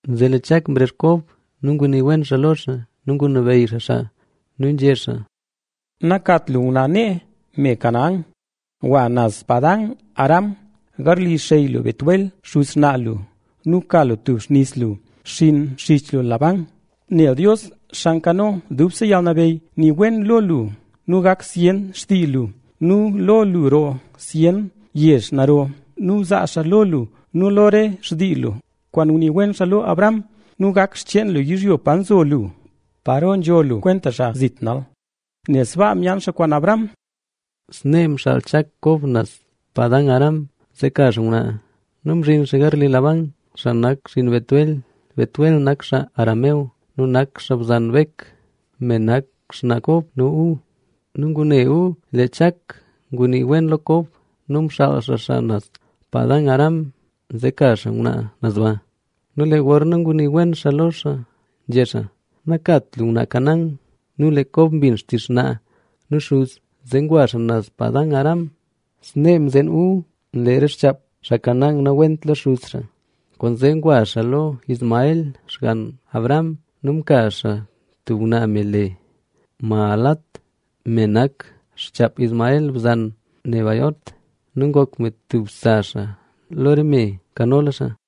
Zee lee Chak mrezh Kob nu ngunii wen xaa lo xaa nu ngunabeyy xaa xaa nu nzhé xaa: —Nakat lu ngwnaa nee, me Canaán. Gwa naz Padan-aram, garli xey lu Betuel, xuz xnaa lu nu ka lu tub xnis lu, xiin xich lu Labán. Nel Dios, Xaa Nkano Dubse Yalnabeyy nii wen lo lu nu gak zyen xtii lu; nu lo lu roo zyen yezh naro. Nu zaa xaa lo lu nu lo re xtii lu kwaan ngunii wen xaa lo Abraham nu gak xcheen lu yizhyo pa nzo lu, paro nzho lu kwenta xaa zit nal. Nel sbaa myaan xaa kwaan Abraham. Snee mxaal Chak Kob naz Padan-aram, zee ka xaa ngwnaa. Nu mzhin xaa garli Labán, xaa nak xinn Betuel. Betuel nak xaa Aram nu nak xaa bzan Bek, me nak xnaa Kob nu Esaú. Nu ngune Esaú lee Chak ngunii wen lo Kob nu mxaal xaa xaa naz Padan-aram, zee ka xaa ngwnaa naz ba. Nu lee gorna ngunii wen xaa lo xaa nzhé xaa: “Nakat lu ngwnaa Canaán”. Nu lee Kob mbin xtizh xnaa nu xuz, zee ngwa xaa naz Padan-aram. Snee mzeen Esaú lee re xchaap xaa Canaán nawent lo xuz xaa. Kwaanzee ngwa xaa lo Ismael, xgann Abraham nu mka xaa tub ngwnaa me le Mahalat, me nak xchaap Ismael, bzan Nebaiot. Nu ngok me stub sa xaa lo re me nkanola xaa.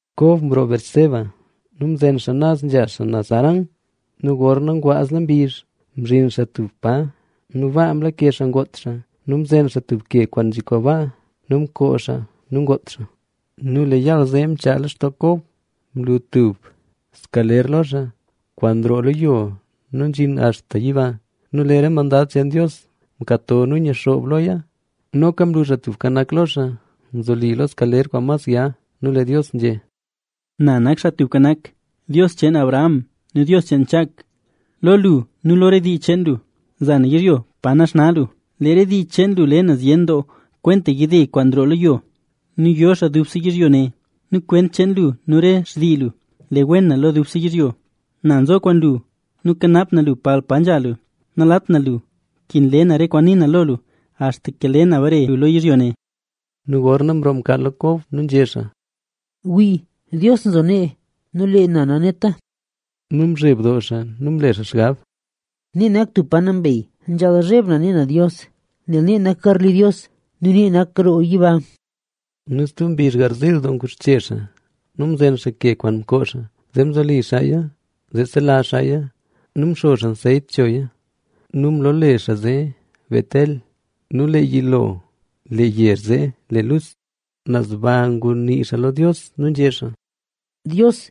Kob mroo Beerseba nu mzen naz nzha naz Harán. Nu gorna ngwaazla mbizh mzhin xaa tub pa nu baa mlake xaa ngoot xaa. Nu mzen xaa tub ke kwaan nzhikwaa baa, mkoo xaa nu ngoot xaa. Nu lee yaal zee mchaa lextoo Kob, mlu tub skaler lo xaa, kwaan nroo lo yo nu nzhin axta yiba. Nu lee re mandad cheen Dios nkato nu nyixoob loya. Noka mlu Xaa Tubka Nak lo xaa nzoli lo skaler kwaan mas ya. Nu lee Dios nzhé: —Na nak Xaa Tubka Nak, Dios cheen Abraham nu Dios cheen Chak. Lo lu nu lo re dii cheen lu, za na yizhyo pa naxna lu. Lee re dii cheen lu le na zyen doo kwenta yide kwaan nroo lo yo nu yo xaa dubse yizhyo ne. Nu kwent cheen lu nu rese xtii lu le wen na lo dubse yizhyo. Na nzo kwaan lu nu kanap na lu palpa nzha lu. Nalat na lu, nkin le na re kwaan ni na lo lu, axtaka le na bare lu lo yizhyo ne. Nu gorna mroo mkaal lo Kob nu nzhé xaa: “¡Wli, Dios nzo nee nu lee na naneta!” Nu mzheb doo xaa nu mle xaa xgab: “¡Nee nak tub pa nambey, nzhaal zheb na ne na Dios, nel nee nak garli Dios nu nee nak roo yiba!” Nu stub mbizh garziil doo nguxche xaa nu mzen xaa ke kwaan mkoo xaa, zee mzoli xaaya zee zelazh xaaya nu mxo xaa anseyt choya. Nu mloole xaa zee, Betel.a Nu lee yilo lee yezh zee le Luz. Naz ba ngunii xaa lo Dios nu nzhé xaa: —Dios,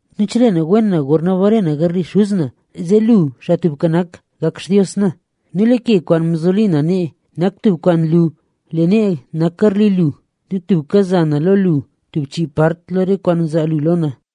nu chelee na wen na gorna bare na garli xuz na, zee lu Xaa Tubka Nak gak Xtios na. Nu lee ke kwaan mzoli na nee nak tub kwaan nlu lee nee nak garli lu. Nu tubka za na lo lu tub part lo chii part lo re kwaan zaa lu lo na.